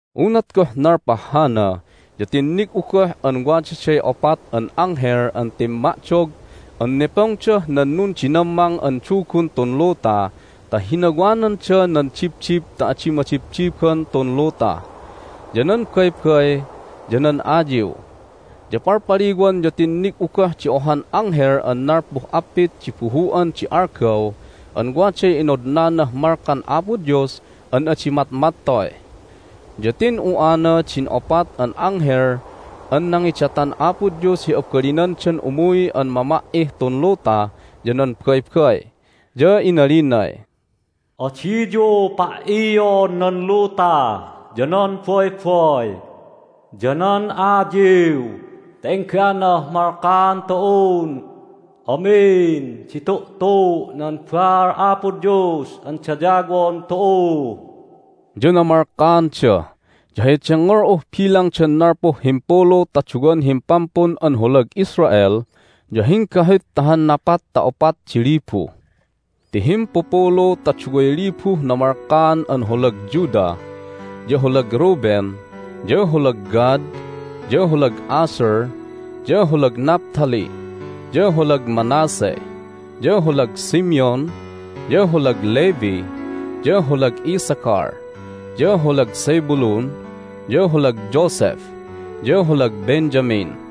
Unat goh nalpah hana ya tinnig'u goh an wadaday opat an anghel an timma'dog an nepongdah nan nundinammang an dugun tun luta ta hinawananda nan dibdib ta adi madibdiban tun luta, ya nan baybay, ya nan ayiw. Ya palpaliwan ya tinnig'u goh di ohan anghel an nalpuh appit di buhu'an di algaw an waday inodnanah malkan Apo Dios an adi matmattoy. Ya tin'u'ana din opat an anghel an nangidatan Apo Dios hi abalinandan umuy an mama"ih tun luta ya nan baybay. Ya inalinay, "Adiyu pa"ion nan luta, ya nan baybay, ya nan ayiw ta engganah malkaan tu'un amin di tu'tu' nan baal Apo Dios an dayawon tu'u." Ya namalkaanda, ya hay dengngol'uh bilangdan nalpuh himpulu ta duwan himpampun an holag Israel ya hinggahut ta han napat ta opat di libu. Ti himpupulu ta duway libuh namalkaan an holag Judah, ya holag Reuben, ya holag Gad, ya holag Asher, ya holag Naphtali, ya holag Manasseh, ya holag Simeon, ya holag Levi, ya holag Issachar, ya holag Zebulun, ya holag Joseph, ya holag Benjamin.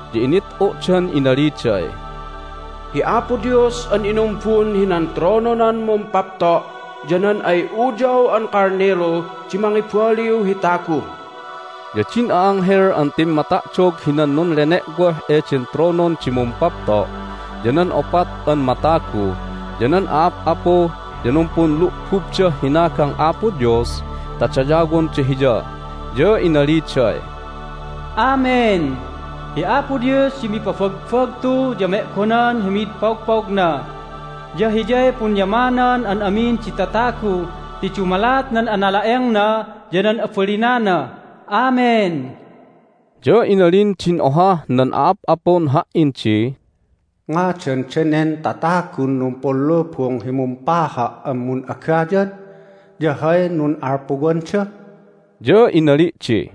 Ya init'u'dan inaliday, "Hi Apo Dios an inumbun hinan trononan Mumpapto' ya nan ay Uyaw an Kalnilu di mangibaliw hi tagu!" Ya din a'anghel an timmata'dog hinan nunlene'woh eden tronon di Mumpapto', ya nan opat an matagu, ya nan a'ap'apu ya numpunlu'bubdah hinagang Apo Dios ta dayawonda Hiya, ya inaliday, "Amen! Hi Apo Dios di mipabagbagtu ya me'gonan hi mid pogpogna, ya Hiyay punyamanan an amin di tatagu ti dumalat nan anala'engna ya nan abalinana! Amen!" Ya inalin din ohah nan a'ap'apun ha"in di, "Ngadan danen tatagun numpunlubung hi mumpaha' an mun'agayad? Ya hay nun'alpuwanda?" Ya inali' di,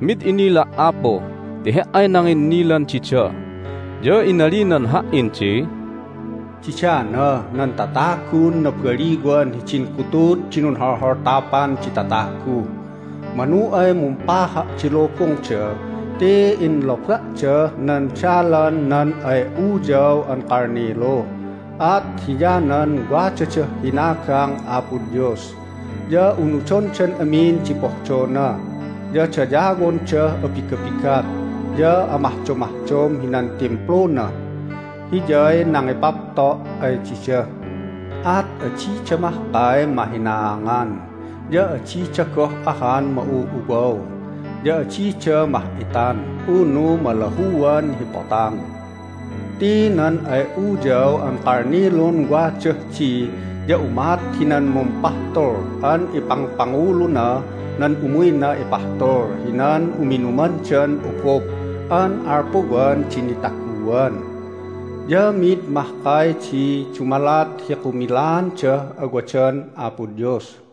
"Mid inila', apu, ti he"ay nanginnilan dida." Ya inalinan ha"in di, "Didana nan tatagun nabaliwan hidin gutud di nunholholtapan di tatagu. Manu ay mumpaha' di lubungda ti inloba'dah nan dalan nan ay Uyaw an Kalnilu. At hiyanan wadadah hinagang Apo Dios, ya unudondan amin di pohdona, ya dayawondah abigabigat ya amahdomahdom hinan Timpluna. Hiyay nangipapto' ay dida, at adida mahkay mahinaangan, ya adida goh ahan ma'u'uwaw, ya adida mah'itan unu malahuan hi potang. Ti nan ay Uyaw an Kalnilun wadah di, ya umat hinan mumpahtul an ipangpanguluna nan umuyna ipahtul hinan uminumandan obob an alpuwan di nitaguan. Ya mi'id mahkay di dumalat hi kumilaandah awadan Apo Dios."